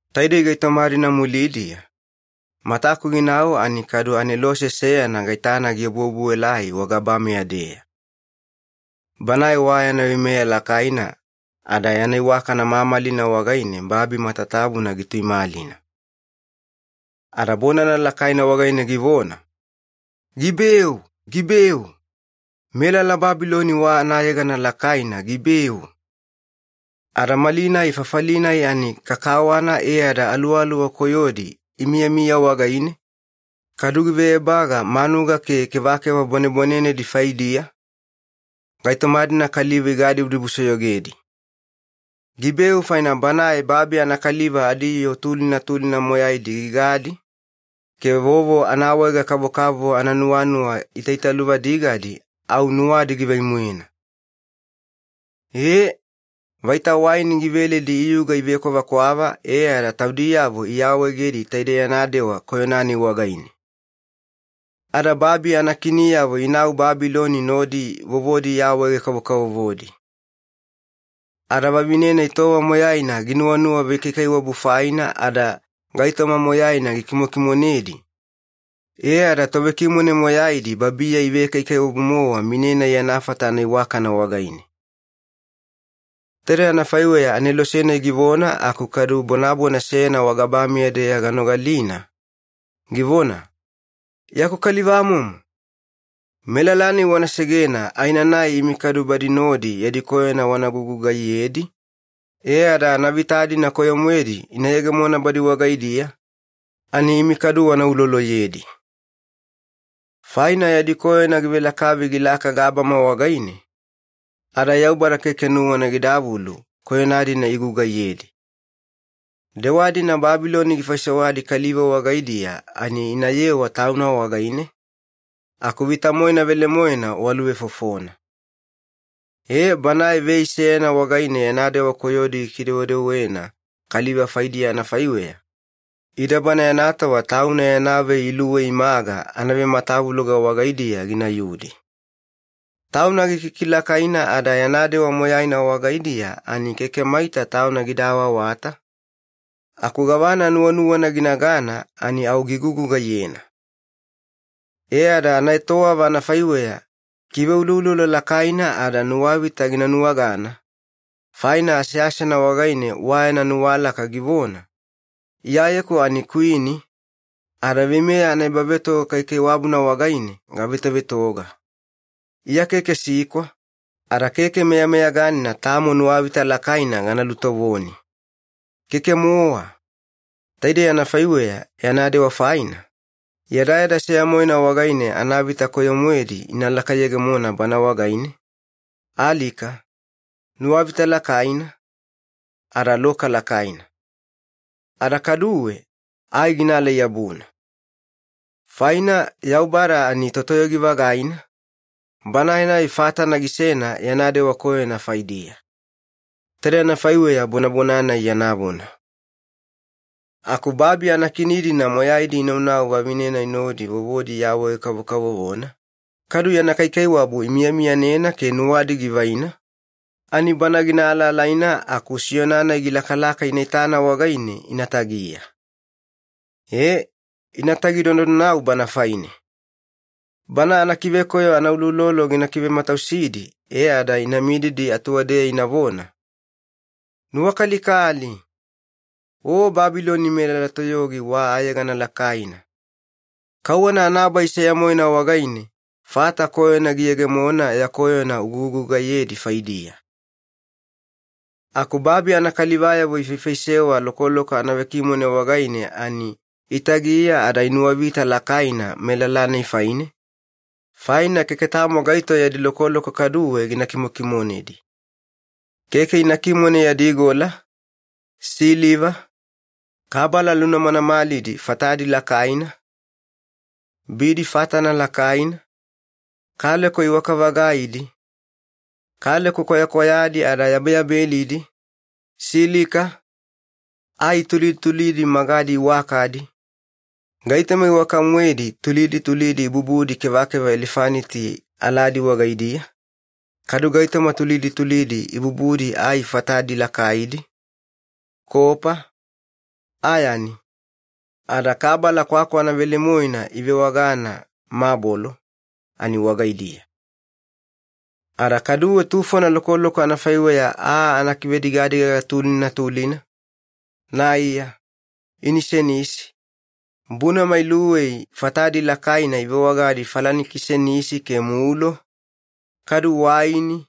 Taidei gaitoma-dina mulidiya, mataku ginau ani kadu anelose seyana gaitana giobuobuelai wagabameya-deya. Banae wa yana veimeya lakaina, ada yana iwakana mamalina wagaine babi matatabuna gituimalina. Ada bonana lakaina wagaine givona, “Gibeu! Gibeu! Melala Babiloni wa anayegana lakaina gibeu! Ada malinai fafali-nai ani kakawana e ada aluwaluwa koyodi imiyamiya wagaine, kadu give ebaga manuga ke kevakeva bwanebwanenedi faidiya, gaitoma-dina kaliva igadibudibusoyogedi. Gibeu faina banae babi anakaliva adiyoo tulina tulina moyaidi gigadi, ke vovo anaawaega-kavokavovo ananuwanuwa itaitaluvadigadi au nuwadi givai-moena. Ee, vaita waini giveledi iyuga ivekwavakwava e ada taudiyavo iawaegedi taide yana dewa koyona-nai wagaine. Ada babi anakiniyavo inau Babiloni nodi vovodi iawaege-kavokavovodi. Ada vavine-nai tova moyaina ginuwanuwa vekaikaiwabu faina ada gaitoma moyaina gikimokimonedi, e ada tovekimone moyaidi babiya ivekaikaiwabu-mowa mine-nai yana fata anaiwakana wagaine.” Taide anafaiweya anelose-nai givona aku kadu bonabona seyana wagabameya-deya ganogalina, givona, “Yaku kalivamomo, melala-nai wana segena aenanai imi kadu badi nodi yadi koyona wana gugugaiyedi, e ada anavita-dina koyo-moedi ina yegemona badi wagaidiya ani imi kadu wana uloloyedi. Faina yadi koyona givelakavi gilaka gabama wagaine, ada Yaubada keke nuwana gidavulu koyona-dina igugaiyedi. Dewa-dina Babiloni gifaisewadi kaliva wagaidiya ani inayewa tauna wagaine, aku vita-moena velemoena waluvefofona. Ee, banae vei seyana wagaine yana dewa koyodi gikidewedewena kaliva faidiya anafaiweya, ida bana yana tova tauna yana vei iluwei imaga anavematavuloga wagaidiya ginayudi. Tauna gikikilakaina ada yana dewa moyaina wagaidiya ani keke maita tauna gida awaawata, aku gavana nuwanuwana ginagana ani au gigugugaiyena. E ada anaetowava anafaiweya kiveuloulolo lakaina ada nuwavita gina nuwagana, faina aseasena wagaine wa yana nuwalaka givona, ‘Iyayeku ani kwini, ada veimeya anaebavetoga kaikaiwabuna wagaine gavetovetoga. Iya keke sikwa, ada keke meyameyaganina tamo nuwavita lakaina gana lutovoni. Keke-mowa!’ Taidei anafaiweya yana dewa faina, yadayada seya-moena wagaine anavita koyo-moedi ina lakayegemona bana wagaine, alika, nuwavita lakaina, ada loka lakaina. Ada kaduwe ai ginaalai-yabuna. Faina Yaubada ani Totoyogi-vagaina, Banae-nai fatana gisena yana dewa koyona faidiya.” Taide anafaiweya bonabona-nai yana vona. Aku babi anakini-dina moyaidi inaunau vavine-nai nodi vovodi iawaege-kavokavovona, kadu yana kaikaiwabu imiyamiyanena ke nuwadi givaina, ani bana gina alaalaina aku siyona-nai gilakalaka ina itana wagaine ina tagiya. Ee, inatagi donadonau bana faine. Bana anakivekoyo anauloulolo gina kivematausidi e ada ina mididi atuwadeya inavona, “Nuwakalikali! O Babiloni melala toyogi wa ayegana lakaina! Kauwana anabai seya-moena wagaine, fata koyona giyegemona ya koyona ugugugaiyedi faidiya.” Aku babi anakalivayavo ifaifaisewa lokoloko anavekimone wagaine ani itagiya ada inuwavita lakaina melala-nai faine, faina keke tamo gaito yadi lokoloko kaduwe gina kimokimonedi. Keke ina kimone yadi gola, siliva, kabala lunamanamalidi fatadi lakaina, bidi fatana lakaina, kaleko iwaka-vagaidi, kaleko kwayakwayadi ada yabeyabelidi, silika, ai tulidi tulidi magadi iwakadi, gaitoma iwaka-moedi tulidi tulidi ibubudi kevakeva elefaniti aladi wagaidiya, kadu gaitoma tulidi tulidi ibubudi ai fatadi lakaidi, kopa, ayani, ada kabala kwakwana velemoena ivewagana ‘mabolo’ ani wagaidiya. Ada kaduwe tufona lokoloko anafaiweya aa anakivedivedigaga tulina tulina, naiya, inisenisi, bunama iluwei fatadi lakaina ivewagadi falanikisenisi ke mulo, kadu waini,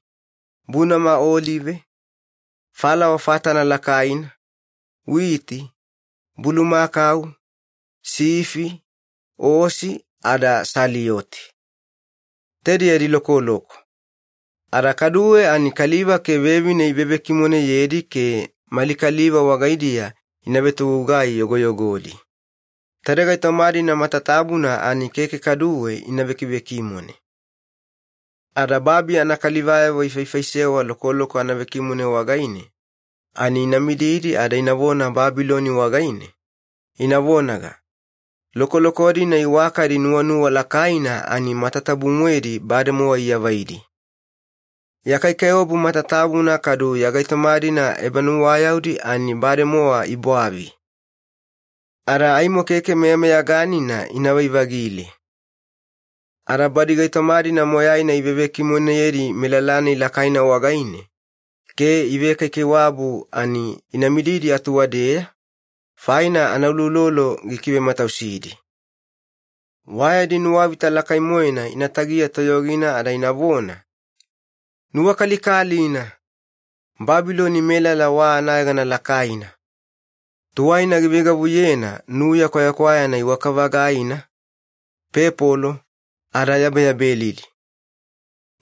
bunama olive, falawa fatana lakaina, witi, bulumakau, sifi, osi, ada salioti. Taide yadi lokoloko. Ada kaduwe ani kaliva ke vevine ivevekimoneyedi ke mali kaliva wagaidiya ina vetogugai yogoyogodi. Taide gaitoma-dina matatabuna ani keke kaduwe ina vekivekimone. Ada babi anakalivayavo ifaifaisewa lokoloko anavekimone wagaine, ani ina mididi ada inavona Babiloni wagaine, ina vonaga, “Lokoloko-dina iwakadi nuwanuwa lakaina ani matatabu-moedi bademowa iavaidi. Ya kaikaiwabu matatabuna kadu ya gaitoma-dina ebanuwayaudi ani bademowa ibwavi. Ada aimo keke meyameyaganina inavai-vagile.” Ada badi gaitoma-dina moyaina ivevekimoneyedi melala-nai lakaina wagaine ke ivekaikaiwabu ani ina mididi atuwadeya, faina anauloulolo gikivematausidi. Wa yadi nuwavita lakai-moena ina tagiya toyogina ada inavona, “Nuwakalikalina, Babiloni melala wa anayegana lakaina! Tuwaina giveigavuyena nuya kwayakwayana iwaka-vagaina, pepolo, ada yabeyabelidi.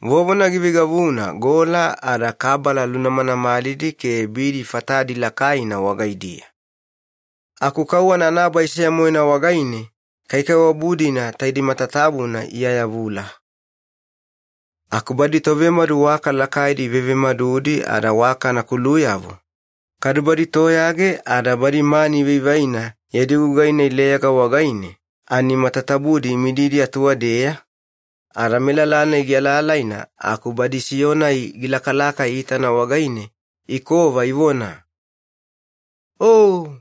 Vovona giveigavuna gola ada kabala lunamanamalidi ke bidi fatadi lakaina wagaidiya. Aku kauwana anabai seya-moena wagaine kaikaiwabu-dina taidei matatabuna iayavula!” Aku badi tovemadu waka lakaidi ivevemadudi ada waka anakuluyavo, kadu badi toyage ada badi mani ivaivaina yadi gugai-nai leyaga wagaine, ani matatabudi imididi atuwadeya, ada melala-nai gialaalaina aku badi siyona-nai gilakalaka iitana wagaine, ikova ivona, “O,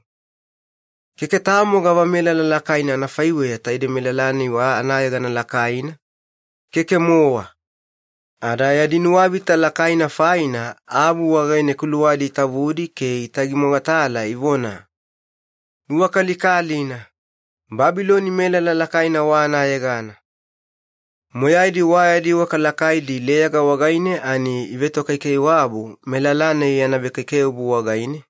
keke tamo gavamelala lakaina anafaiweya taidei melala-nai wa anayegana lakaina, keke-mowa!” Ada yadi nuwavita lakaina faina, avu wagaine kuluwadi itavudi ke itagi mogatala ivona, “Nuwakalikalina, Babiloni melala lakaina wa anayegana! Moyaidi wa yadi waka lakaidi leyaga wagaine ani ivetokaikaiwabu melala-nai yana vekaikaiwabu wagaine,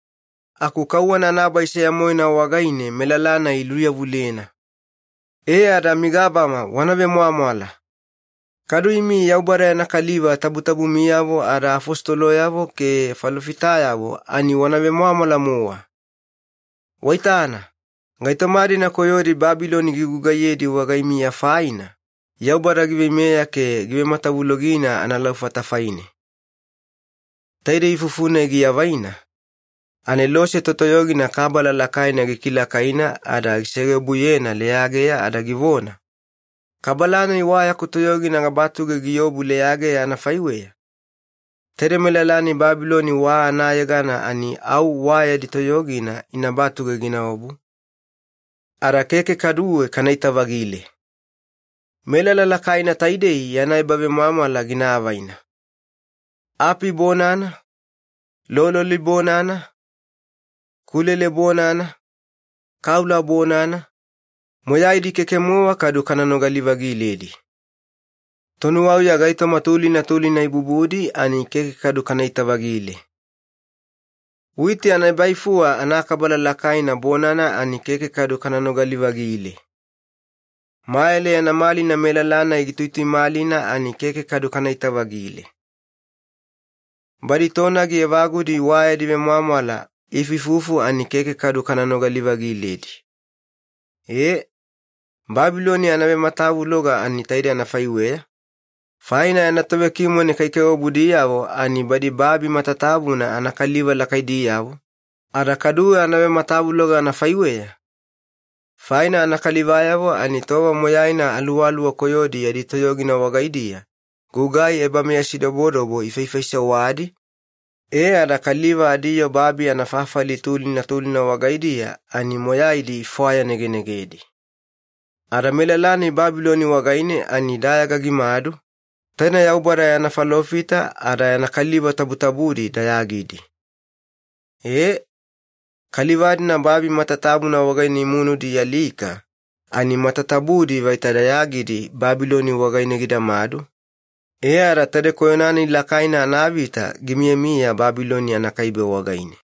aku kauwana anabai seya-moena wagaine melala-nai iluyavulena! E ada migabama wana vemwamwala! Kadu imi Yaubada yana kaliva tabutabumiyavo ada afositoloyavo ke falofitayavo, ani wana vemwamwala-mowa! Waitana, gaitoma-dina koyodi Babiloni gigugaiyedi wagaimiya faina, Yaubada giveimeya ke givematavulogina analaufata faine.” Taide ifufu-nai giavaina, anelose totoyogina kabala lakaina gikilakaina ada gisegeobuyena leyageya ada givona, “Kabala-nai wa yaku toyogina gabatuge giobu leyageya anafaiweya, taide melala-nai Babiloni wa anayegana ani au wa yadi toyogina ina batuge ginaobu, ada keke kaduwe kanaita-vagile. Melala lakaina taidei yana ebavemwamwala gina avaina. Api bonana, lololi bonana, kulele bonana, kaula bonana, moyaidi keke-mowa kadu kana nogali-vagiledi. Tonuwauya gaitoma tulina tulina ibubudi ani keke kadu kanaita-vagile. Witi anaebaifuwa anakabala lakaina bonana ani keke kadu kana nogali-vagile. Mayale yana malina melala-nai gituituimalina ani keke kadu kanaita-vagile. Badi tonagi evagudi wa yadi vemwamwala iifuifufu ani keke kadu kana nogali-vagiledi. Ee, Babiloni anavematavuloga ani taide anafaiweya, faina yana tovekimone kaikaiwabudiyavo ani badi babi matatabuna anakaliva lakaidiyavo, ada kaduwe anavematavuloga anafaiweya, faina anakalivayavo ani tova moyaina aluwaluwa koyodi yadi toyogina wagaidiya gugai meyasidobodobo ifaifaisewadi, e ada kaliva adiyoo babi anafafali tulina tulina wagaidiya ani moyaidi ifwayanegenegedi. Ada melala-nai Babiloni wagaine ani dayaga gimadu, taine Yaubada yana falofita ada yana kaliva tabutabudi dayagidi. Ee, kaliva-dina babi matatabuna wagaine imunudi ialika ani matatabudi vaita dayagidi Babiloni wagaine gidamadu, e ada taide koyona-nai lakaina anavita gimiyamiya Babiloni anakaibe wagaine.”